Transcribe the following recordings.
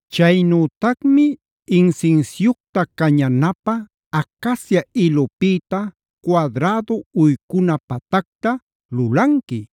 “Chaynütacmi insinsiucta cañanapä acacia ilupïta cuadrädu uycuna patacta lulanqui.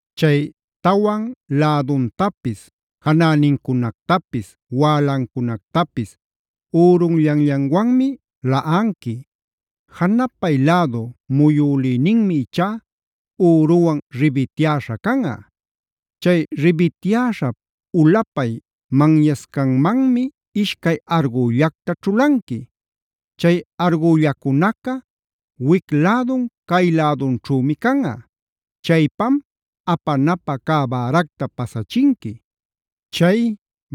Chay tawan läduntapis, janänincunactapis, wälancunactapis ürunllanllanwanmi laꞌanqui. Janapay lädu muyülïninmi ichá üruwan ribityäśha canꞌa. Chay ribityäśhap ulapay manyancascanmanmi ishcay argüllacta ćhulanqui. Chay argüllacunaca wic lädun cay lädunćhümi canꞌa. Chaypam apanapä cä bäracta pasachinqui. Chay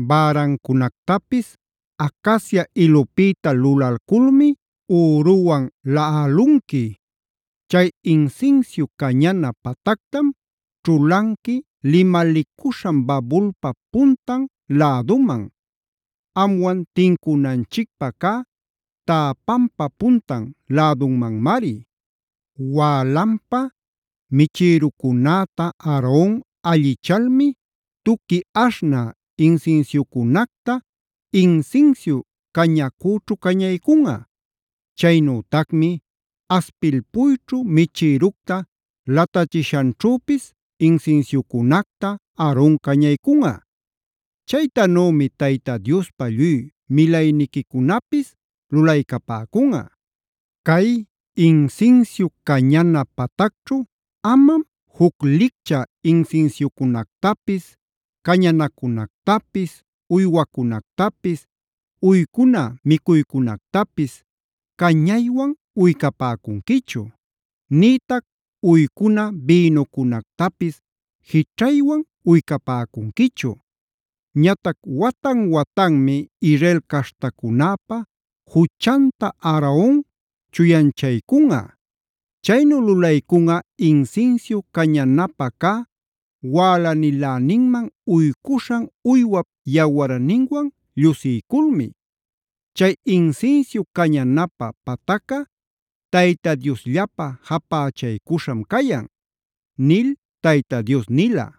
bärancunactapis acacia ilupïta lulalculmi üruwan laꞌalunqui. Chay insinsiu cañana patactam ćhulanqui limalicuśhan babulpa puntan läduman; amwan tincunanchicpä cä täpanpa puntan lädumanmari. “Wälanpa michïrucunäta Aaron allichalmi tuqui aśhnä insinsiucunacta insinsiu cañacüćhu cañaycunꞌa. Chaynütacmi aspilpuyćhu michïructa latachiśhanćhüpis insinsiucunacta Aaron cañaycunꞌa. Chaytanümi Tayta Diospa lluy milayniquicunapis lulaycapäcunꞌa. Cay insinsiu cañana patacćhu amam juc licchä insinsiucunactapis, cañanacunactapis, uywacunactapis, uycuna micuycunactapis cañaywan uycapäcunquichu; nïtac uycuna bïnucunactapis jićhaywan uycapäcunquichu. Ñatac watan-watanmi Israel caśhtacunäpa juchanta Aaron chuyanchaycunꞌa. Chaynu lulaycunꞌa insinsiu cañanapä cä wälaniläninman uycuśhan uywap yawarninwan llusiyculmi. Chay insinsiu cañanapä patacca Tayta Diosllapä japächaycuśham cayan” nil Tayta Dios nila.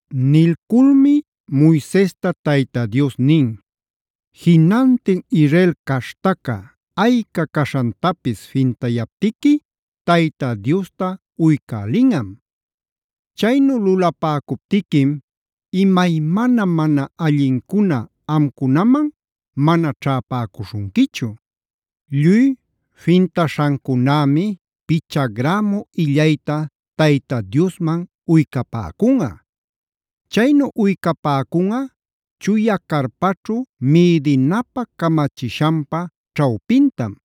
Nilculmi Moisesta Tayta Dios nin: “Jinantin Israel caśhtaca ayca caśhantapis fintayaptiqui Tayta Diosta uycälinꞌam. Chaynu lulapäcuptiquim imaymana mana allincuna amcunaman mana ćhäpäcuśhunquichu. Lluy fintaśhancunämi picha grämu illayta Tayta Diosman uycapäcunꞌa. Chaynu uycapäcunꞌa chuya carpaćhu mïdinapä camachishanpa ćhawpintam.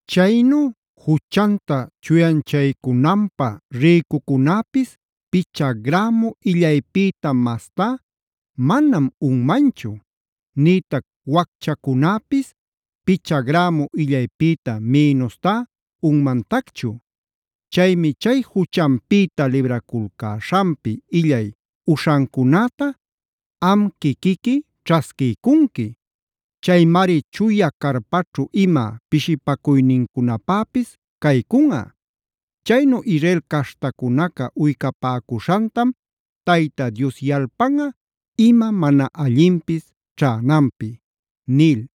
Chaynu juchanta chuyanchaycunanpä rïcucunäpis picha grämu illaypïta mastá manam unmanchu; nïtac wacchacunäpis picha grämu illaypïta minustá unmantacchu. Chaymi chay juchanpïta libraculcäśhanpi illay uśhancunäta am quiquiqui ćhasquiycunqui. Chaymari chuya carpaćhu ima pishipacuynincunapäpis caycunꞌa. Chaynu Israel caśhtacunaca uycapäcuśhantam Tayta Dios yalpanꞌa ima mana allinpis ćhänanpi” nil.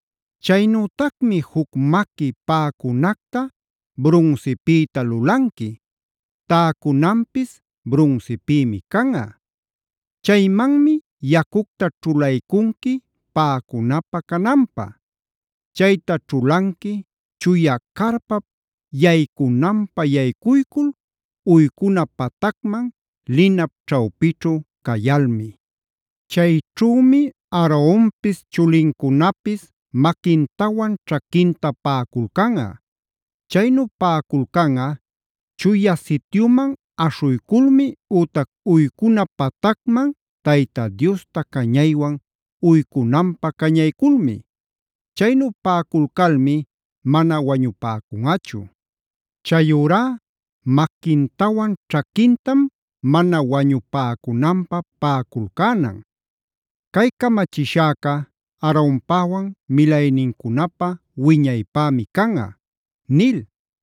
“Chaynütacmi juc maqui paꞌacunacta brunsipïta lulanqui; täcunanpis brunsipïmi canꞌa.a Chaymanmi yacucta ćhulaycunqui paꞌacunapä cananpä. Chayta ćhulanqui chuya carpap yaycunanpä yaycuycul uycuna patacman linap ćhawpićhu cayalmi. Chayćhümi Aaronpis, chulincunapis maquintawan ćhaquinta paꞌaculcanꞌa. Chaynu paꞌaculcanꞌa Chuya Sityuman aśhuyculmi ütac uycuna patacman Tayta Diosta cañaywan uycunanpä cañayculmi. Chaynu paꞌaculcalmi mana wañupäcunꞌachu. Chayurá maquintawan ćhaquintam mana wañupäcunanpä paꞌaculcänan. Cay camachishäca Aaronpäwan milaynincunapä wiñaypämi canꞌa” nil.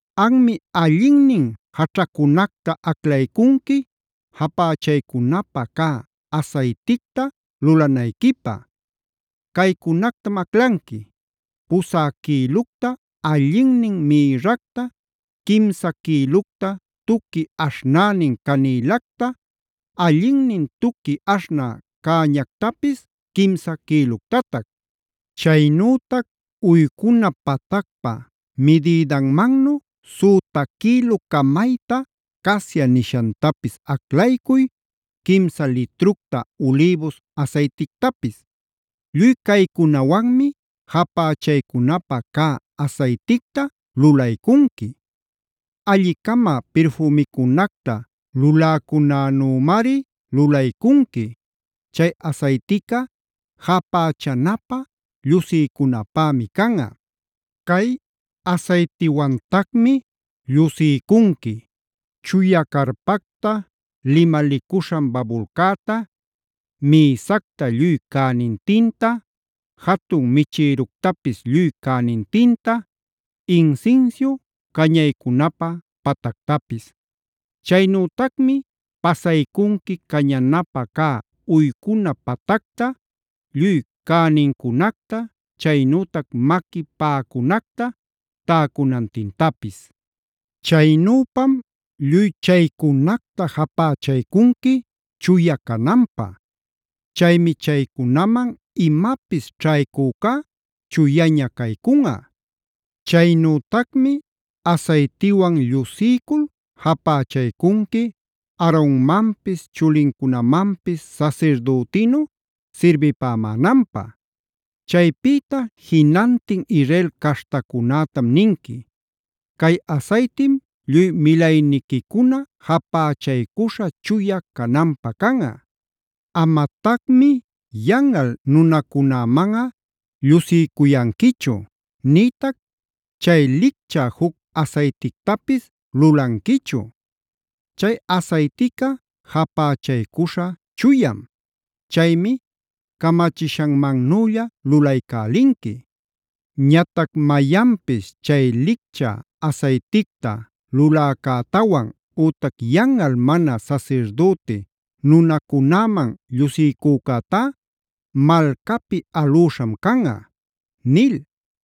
“Anmi allinnin jaćhacunactab aclaycunqui japächaycunapä cä asayticta lulanayquipä. Caycunactam aclanqui: Pusä quïlucta allinnin mïrracta, quimsa quïlucta tuqui aśhnänin canïlacta, allinnin tuqui aśhnä cäñactapis quimsa quïluctatac. Chaynütac uycuna patacpa midïdanmannu süta quïlu camayta casia nishantapis aclaycuy, quimsa litructa ulïbus asaytictapis. Lluy caycunawanmi japächaycunapä cä asayticta lulaycunqui. Alli-cama pirfümicunacta luläcunänümari lulaycunqui. Chay asaytica japächanapä llusiycunapämi canꞌa. Cay asaytiwantacmi llusiycunqui: chuya carpacta, limalicuśhan babulcäta, mïsacta lluy cänintinta, jatun michïructapis lluy cänintinta, insinsiu cañaycunapä patactapis. Chaynütacmi pasaycunqui cañanapä cä uycuna patacta lluy cänincunacta, chaynütac maqui paꞌacunacta täcunantintapis. Chaynüpam lluy chaycunacta japächaycunqui chuya cananpä. Chaymi chaycunaman imapis ćhaycücá chuyaña caycunꞌa. “Chaynütacmi asaytiwan llusiycul japächaycunqui Aaronmanpis chulincunamanpis sasirdütïnu sirbipämänanpä. Chaypïta jinantin Israel caśhtacunätam ninqui: ‘Cay asaytim lluy milayniquicuna japächaycuśha chuya cananpä canꞌa. Amatacmi yanꞌal nunacunämanꞌa llusiycuyanquichu, nïtac chay licchä juc asaytictapis lulanquichu. Chay asaytica japächaycuśha chuyam. Chaymi camachishanmannülla lulaycälinqui. Ñatac mayanpis chay licchä asayticta luläcätawan ütac yanꞌal mana sasirdüti nunacunäman llusiycücätá malcapi alüśham canꞌa’” nil.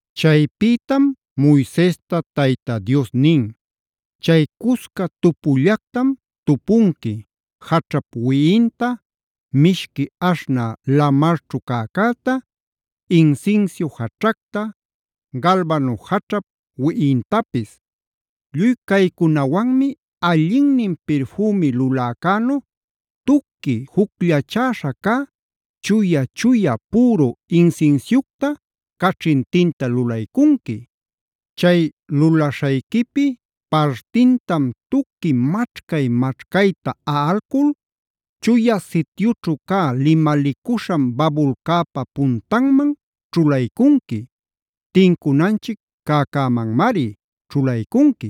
Chaypïtam Moisesta Tayta Dios nin: “Chay cusca tupullactam tupunqui: jaćhap wiꞌinta, mishqui aśhnä lamarćhu cäcäta, insinsiu jaćhacta, galbano jaćhap wiꞌintapis. Lluy caycunawanmi allinnin pirfümi luläcänu tuqui jucllachäśha cä chuya-chuya püru insinsiucta caćhintinta lulaycunqui. Chay lulaśhayquipi partintam tuqui maćhcay-maćhcayta aꞌalcul Chuya Sityućhu cä limalicuśhan babulcäpa puntanman ćhulaycunqui; tincunanchic cäcämanmari ćhulaycunqui.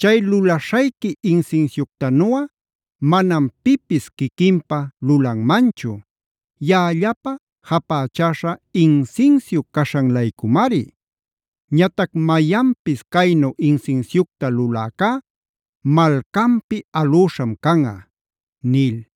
Chay lulaśhayqui insinsiuctanuꞌa manam pipis quiquinpä lulanmanchu; yaꞌallapä japächäśha insinsiu caśhan-laycumari. Ñatac mayanpis caynu insinsiucta luläcá malcanpi alüśham canꞌa” nil.